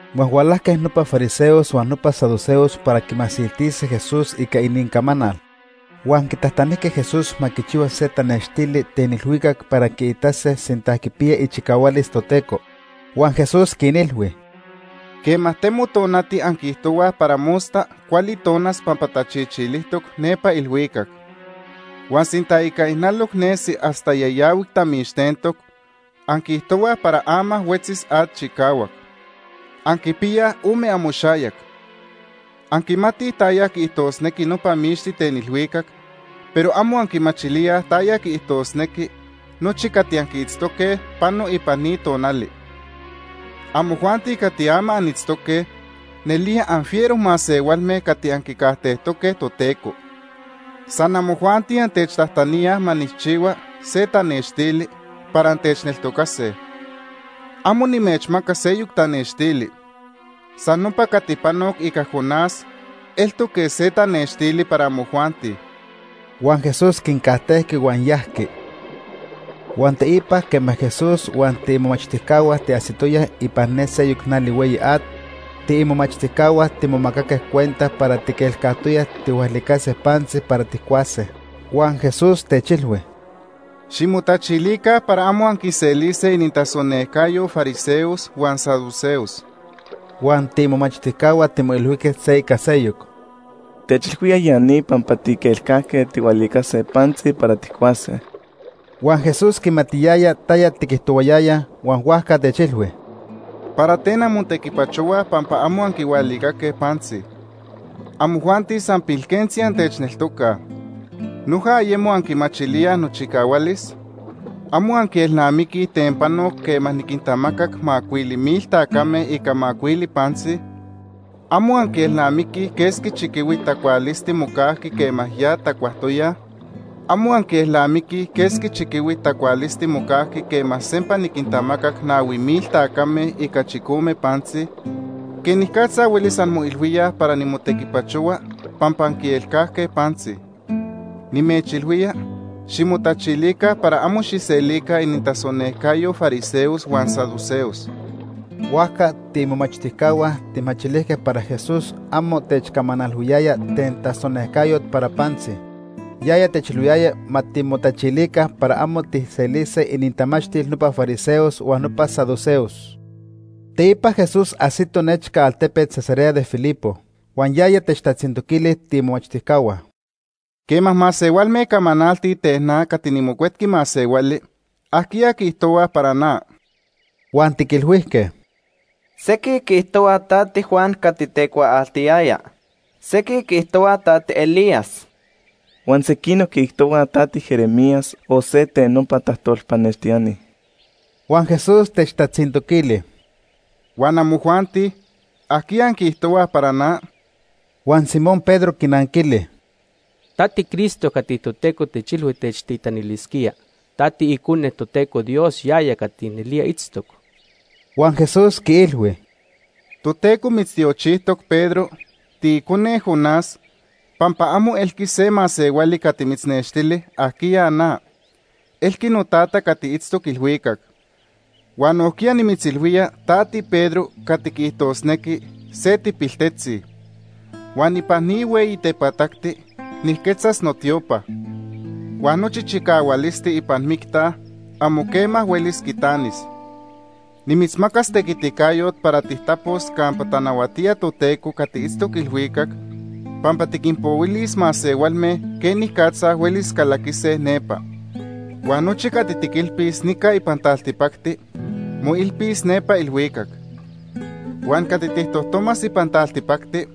Huan hualajque nopa fariseos huan nopa saduceos para quimasiltise Jesús ica inincamanal. Huan quitajtanijque Jesús ma quichihua se tanextili ten ilhuicac para quiitase sinta quipiya ichicahualis Toteco. Huan Jesús quinilhui: “Quema temo tonati anquiijtohuaj para mosta cuali tonas pampa tachichilijtoc nepa ilhuicac. Huan sinta ica ijnaloc nesi hasta yayahuic tamixtentoc, anquiijtohuaj para ama huetzis at chicahuac. ¡Anquipiyaj ome amoxayac! Anquimatij taya quiijtosnequi nopa mixti ten ilhuicac, pero amo anquimachilíaj taya quiijtosnequi nochi cati anquiitztoque pano ipan ni tonali. Amojuanti cati ama anitztoque nelía anfiero masehualme cati anquicajtejtoque Toteco. San amojuanti antechtajtaníaj ma nijchihua se tanextili para antechneltocase. Amo nimechmacas seyoc tanextili. San nopa cati panoc ica Jonás eltoc quej se tanextili para amojuanti.” Huan Jesús quincajtejqui huan yajqui. Huan teipa quema Jesús huan tiimomachtijcahua tiajsitoyaj ipan ne seyoc nali hueyi at, tiimomachtijcahua timomacaque cuenta para tiquelcajtoyaj tijhualicase pantzi para tijcuase. Huan Jesús techilhui: ―Ximotachilica para amo anquiselise inintasonejcayo fariseos huan saduceos. Huan tiimomachtijcahua timoilhuijque se ica seyoc: ―Techilhuía ya ni pampa tiquelcajque tijhualicase pantzi para tijcuase. Huan Jesús quimatiyaya taya tiquijtohuayayaj, huan huajca techilhui: ―¿Para ten anmotequipachohuaj pampa amo anquihualicaque pantzi? Amojuanti san pilquentzi antechneltocaj. ¿Noja ayemo anquimachilíaj nochicahualis? ¿Amo anquielnamiquij ten panoc quema niquintamacac macuili mil tacame ica macuili pantzi? ¿Amo anquielnamiquij quesqui chiquihuit tacualisti mocajqui quema ya tacuajtoyaj? ¿Amo anquielnamiquij quesqui chiquihuit tacualisti mocajqui quema sempa niquintamacac nahui mil tacame ica chicome pantzi? ¿Quenicatza huelis anmoilhuíaj para nimotequipachohua pampa anquielcajque pantzi? Nimechilhuiyaya ximotachilica para amo xijselica inintasonejcayo fariseos huan saduceos. Huajca tiimomachtijcahua tijmachilijque para Jesús amo techcamanalhuiyaya ten tasonejcayot para pantzi. Yaya techilhuiyaya ma timotachilica para amo tijselise inintamachtil nopa fariseos huan nopa saduceos. Teipa Jesús ajsito nechca altepet Cesarea de Filipo. Huan yaya techtatzintoquili tiimomachtijcahua: ―Quema masehualme camanaltij ten na cati niMocuetqui Masehuali, ¿ajquiya quiijtohuaj para na? Huan tiquilhuijque: ―Sequij quiijtohuaj ta tiJuan cati tecuaaltiyaya. Sequij quiijtohuaj ta tiElías. Huan sequinoc quiijtohuaj ta tiJeremías o se nopa tajtolpanextiani. Huan Jesús techtatzintoquili: ―¿Huan amojuanti? ¿Ajquiya anquiijtohuaj para na? Huan Simón Pedro quinanquili: ―Ta tiCristo cati Toteco techilhui techtitanilisquía. Ta tiIcone Toteco Dios yaya cati nelía itztoc. Huan Jesús quiilhui: ―Toteco mitztiochijtoc Pedro, tiicone Jonás, pampa amo elqui se masehuali cati mitznextili ajquiya na, elqui noTata cati itztoc ilhuicac. Huan nojquiya nimitzilhuía ta tiPedro cati quiijtosnequi se tipiltetzi. Huan ipan ni hueyi tepatacti nijquetzas notiopa. Huan nochi chicahualisti ipan micta, amo quema huelis quitanis. Nimitzmacas tequiticayot para tijtapos campa tanahuatía Toteco cati itztoc ilhuicac, pampa tiquinpohuilis masehualme quenicatza huelis calaquise nepa. Huan nochi cati tiquilpis nica ipan taltipacti, moilpis nepa ilhuicac. Huan cati tijtojtomas ipan taltipacti,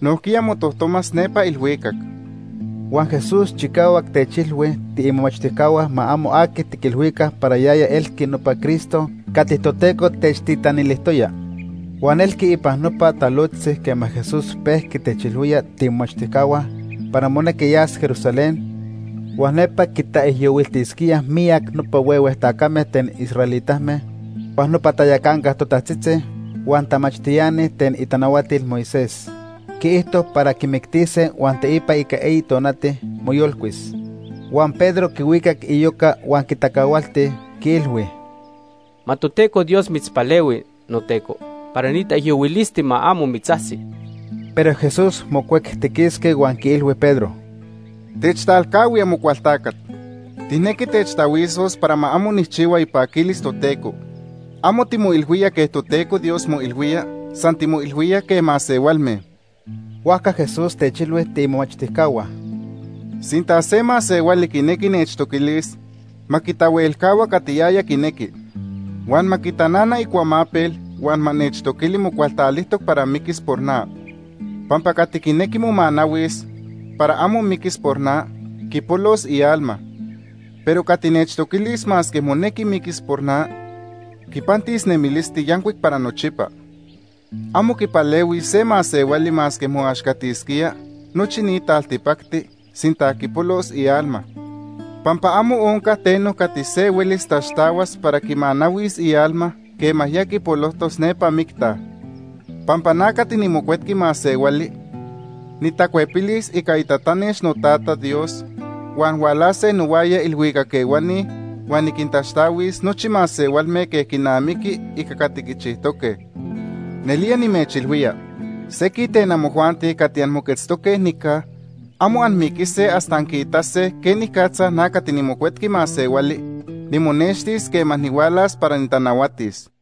nojquiya motojtomas nepa ilhuicac. Huan Jesús chicahuac techilhui tiimomachtijcahua ma amo aqui tiquilhuica para yaya elqui nopa Cristo cati Toteco techtitanilijtoya. Huan elqui ipan nopa talojtzi quema Jesús pejqui techilhuía tiimomachtijcahua para monequi yas Jerusalén, huan nepa quitaijyohuiltisquíaj miyac nopa huehue tacame ten israelitame, huan nopa tayacanca totajtzitzi, huan tamachtiani ten itanahuatil Moisés. Quiijto para quimictise huan teipa ica eyi tonati, moyolcuis. Huan Pedro quihuicac iyoca huan quitacahualti, quiilhui: ―Ma Toteco Dios mitzpalehui, noTeco, para ni taijyohuilisti ma amo mitzajsi. Pero Jesús mocuectiquisqui huan quiilhui Pedro: ―Techtalcahui, Amocualtacat. Tijnequi techtahuisos para ma amo nijchihua ipaquilis Toteco. Amo timoilhuía quej Toteco Dios moilhuía, san timoilhuía quej masehualme. Huajca Jesús techilhui tiimomachtijcahua: ―Sinta se masehuali quinequi nechtoquilis, ma quitahuelcahua cati yaya quinequi. Huan ma quitanana icuamapel huan ma nechtoquili mocualtalijtoc para miquis por na. Pampa cati quinequi momanahuis para amo miquis por na, quipolos ialma. Pero cati nechtoquilis masque monequi miquis por na, quipantis nemilisti yancuic para nochipa. Amo quipalehuis se masehuali masque moaxcatisquía nochi ni taltipacti, sinta quipolos ialma. Pampa amo onca teno cati se huelis taxtahuas para quimanahuis ialma quema ya quipolojtos nepa micta. Pampa na cati niMocuetqui Masehuali nitacuepilis ica itatanex noTata Dios, huan hualase nohuaya iilhuicac ehuani huan niquintaxtahuis nochi masehualme quej quinamiqui ica cati quichijtoque. Nelía nimechilhuía, sequij ten amojuanti cati anmoquetztoque nica, amo anmiquise hasta anquiitase quenicatza na cati niMocuetqui Masehuali nimonextis quema nihualas para nitanahuatis.